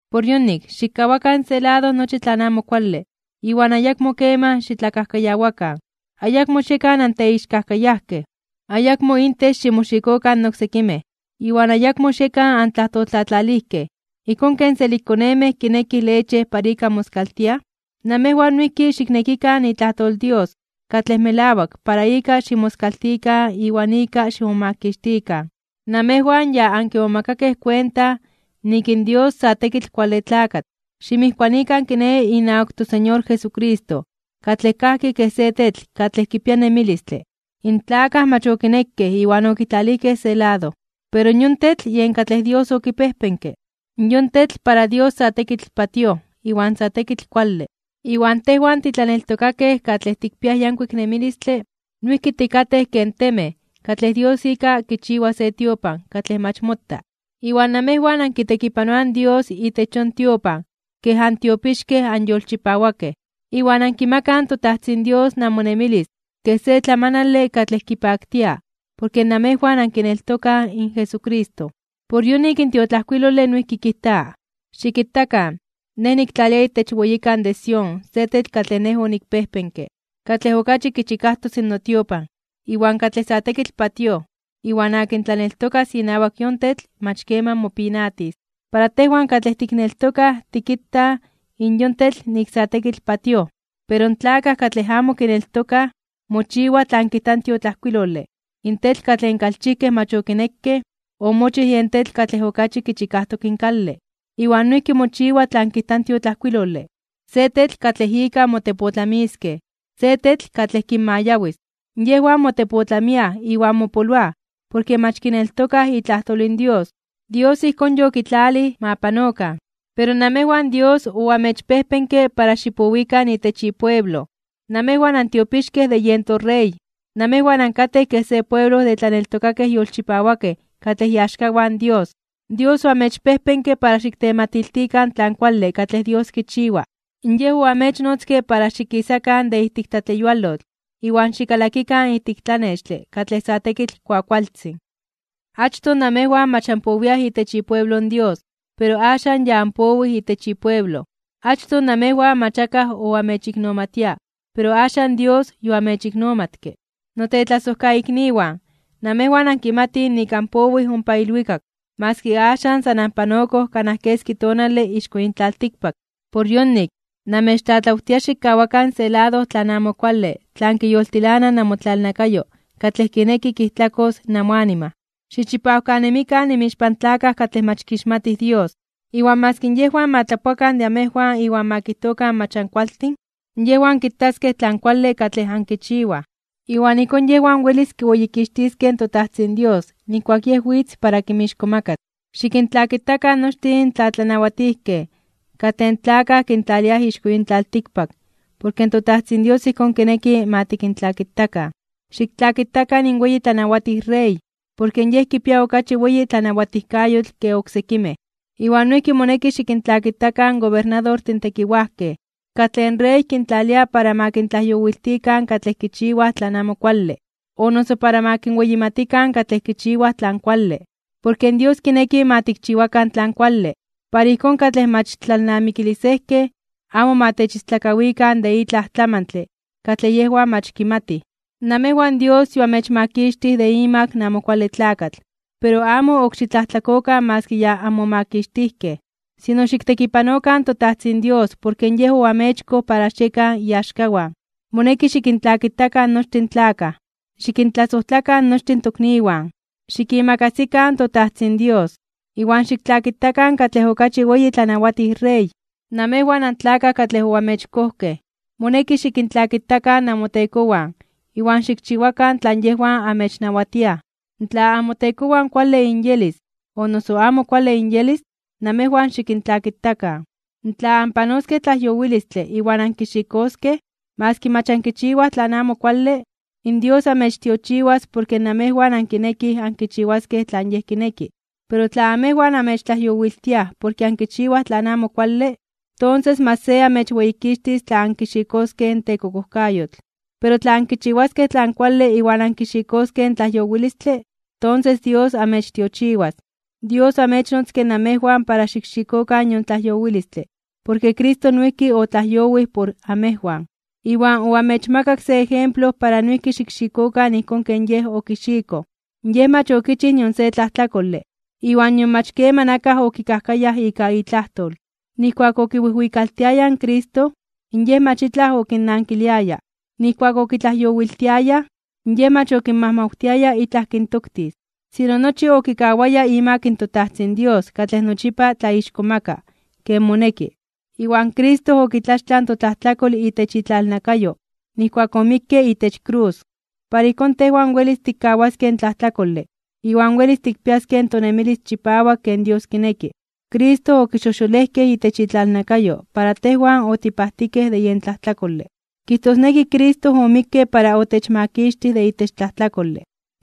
Por yonik, xikkawakan se lado nochi tlan amo kuale iwan ayakmo keman xitlakajkayawakan, ayakmo xiekan anteixkajkayajkej, ayakmo intech ximoxikokan in oksekimej, iwan ayakmo xiekan antlajtoltlatlalijkej. Ijkón ken selikkonemej kinekij leche para ika moskaltiaj, namejwan noijki xiknekikan itlajtol in Dios katlej melawak para ika ximoskaltikan iwan ika ximomakixtikan. Namejwan ya ankimomakakej kuenta nik in Dios sa tekitl kuale tlakatl. Ximijkuanikan, kiné, inawak in toSeñor Jesucristo katlej kajki kej se tetl katlej kipia nemilistle. In tlakaj mach okinekej iwan okitlalijkej se lado, pero yon tetl yen katlej Dios okipejpenke. Yon tetl para Dios sa tekitl patíoj iwan sa tekitl kuale. Iwan tejwan titlaneltokakej katlej tikpiaj yankuik nemilistle noijki tikatej ken temej katlej Dios ika kichiwa se tiopan katlej mach mota. Iwan namejwan ankitekipanoaj in Dios itech yon tiopan kej antiopixkej anyolchipawakej, iwan ankimakaj in toTajtzin Dios namonemilis kej se tlamanale katlej kipaktia porke namejwan ankineltokaj in Jesucristo. Por yonik in tiotlajkuilole noijki kijta: Xikitakan, Nej niktlalia itech weyikan de Sión se tetl katlej Nej onikpejpenke, katlej okachi kichikajtos notiopan, iwan katlej sa tekitl patíoj. Iwan akin tlaneltokas inawak yon tetl mach keman mopinatis. Para tejwan katlej tikneltokaj tikitaj in yon tetl nik sa tekitl patíoj. Pero in tlakaj katlej amo kineltokaj, mochiwa tlan kijta in tiotlajkuilole: In tetl katlej in kalchijkej mach okinekej, omochij yen tetl katlej okachi kichikajtok in kale. Iwan noijki mochiwa tlan kijta in tiotlajkuilole: Se tetl katlej ika motepotlamiskej, se tetl katlej kinmayawis. Yejwan motepotlamiaj iwan mopoloaj porke mach kineltokaj itlajtol in Dios. Dios ijkón yokitlalij ma panokan. Pero namejwan Dios oamechpejpenke para xipowikan itech ipueblo, namejwan antiopixkej de yen toRey. Namejwan ankatej kej se pueblo de tlaneltokakej yolchipawakej katlej iaxkawan Dios. Dios oamechpejpenke para xiktematiltikan tlan kuale katlej Dios kichiwa. Yej oamechnotzke para xikisakan de ijtik tlatleyualotl iwan xikalakikan ijtik tlanextle katlej sa tekitl kuakualtzin. Achtoj namejwan mach anpowiaj itech ipueblo in Dios, pero axan ya anpowij itech ipueblo. Achtoj namejwan mach akaj oamechiknomatia, pero axan Dios yoamechiknomatke. Notetlasojkaikniwan, namejwan ankimatij nik anpowij ompa ilwikak maski axan san anpanokoj kanaj keski tonale ixko yin tlaltikpak. Por yonik, namechtlatlawtia xikkawakan se lado tlan amo kuale tlan kiyoltilana namotlalnakayo katlej kineki kijtlakos namoanima. Xichipawkanemikan inmixpan tlakaj katlej mach kixmatij Dios. Iwan maski yejwan ma tlapoakan de amejwan iwan ma kijtokan mach ankualtin, yejwan kitaskej tlan kuale katlej ankichiwaj, iwan ijkón yejwan welis kiweyikixtiskej in toTajtzin Dios nijkuak Yej witz para kinmixkomakas (kintzonmanas). Xikintlakitakan nochtin in tlatlanawatijkej katlej in tlakaj kintlaliaj ixko yin tlaltikpak porke toTajtzin Dios ijkón kineki ma tikintlakitakan. Xiktlakitakan in weyi tlanawatij rey, porke yej kipia okachi weyi tlanawatijkayotl ke oksekimej. Iwan noijki moneki xikintlakitakan in gobernadortin tekiwajkej, katlej in rey kintlalia para ma kintlajyowiltikan katlej kichiwaj tlan amo kuale, o noso para ma kinweyimatikan katlej kichiwaj tlan kuale. Porke Dios kineki ma tikchiwakan tlan kuale, para ijkón katlej mach tlalnamikilisejkej amo ma techistlakawikan de itlaj tlamantle katlej yejwan mach kimatij. Namejwan Dios yoamechmakixtij de imak in Amo Kuale Tlakatl, pero amo ok xitlajtlakokan maski ya anmomakixtijkej. Sino xiktekipanokan toTajtzin Dios porke Yej oamechkoj para xiekan iaxkawan. Moneki xikintlakitakan nochtin tlakaj. Xikintlasojtlakan nochtin tokniwan, xikimakasikan toTajtzin Dios, iwan xiktlakitakan katlej okachi weyi tlanawatij rey. Namejwan antlakaj katlej oamechkojkej, moneki xikintlakitakan namotekowan iwan xikchiwakan tlan yejwan amechnawatiaj. Tla namotekowan kuale inyelis o noso amo kuale inyelis, namejwan xikintlakitakan. Tla anpanoskej tlajyowilistle iwan ankixikoskej, maski mach ankichiwaj tlan amo kuale, in Dios amechtiochiwas porke namejwan ankinekij ankichiwaskej tlan Yej kineki. Pero tla amejwan amechtlajyowiltiaj porke ankichiwaj tlan amo kuale, tonses mach se amechweyikixtis tla ankixikoskej in tekokojkayotl. Pero tla ankichiwaskej tlan kuale iwan ankixikoskej in tlajyowilistle, tonses Dios amechtiochiwas. Dios oamechnotzke namejwan para xikxikokan yon tlajyowilistle porke Cristo noijki otlajyowij por amejwan, iwan oamechmakak se ejemplo para noijki xikxikokan ijkón ken Yej okixikoj. Yej mach okichij nion se tlajtlakole, iwan nion mach keman akaj okikajkayaj ika itlajtol. Nijkuak okiwijwikaltiayaj in Cristo, in Yej mach itlaj okinnankiliaya. Nijkuak okitlajyowiltiayaj, Yej mach okinmajmawtiaya itlaj kintoktis, sino nochi okikawaya imak toTajtzin Dios katlej nochipa tlaixkomaka (tlatzonmana) ken moneki. Iwan Cristo okitlaxtlaj in totlajtlakol itech itlalnakayo nijkuak omikke itech krus. Para ijkón tejwan welis tikkawaskej in tlajtlakole iwan welis tikpiaskej in tonemilis chipawak ken Dios kineki. Cristo okixojxolejkej itech itlalnakayo para tejwan otipajtikej de yen tlajtlakole, kijtosneki Cristo omikke para otechmakixtij de itech tlajtlakole.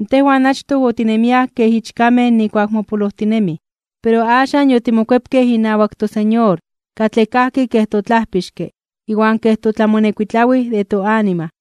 Tejwan achtoj otinemiaj kej ichkamej nijkuak mopolojtinemij, pero axan yotimokuepkej inawak toSeñor katlej kajki kej toTlajpixke iwan kej toTlamonekuitlawij de toanima.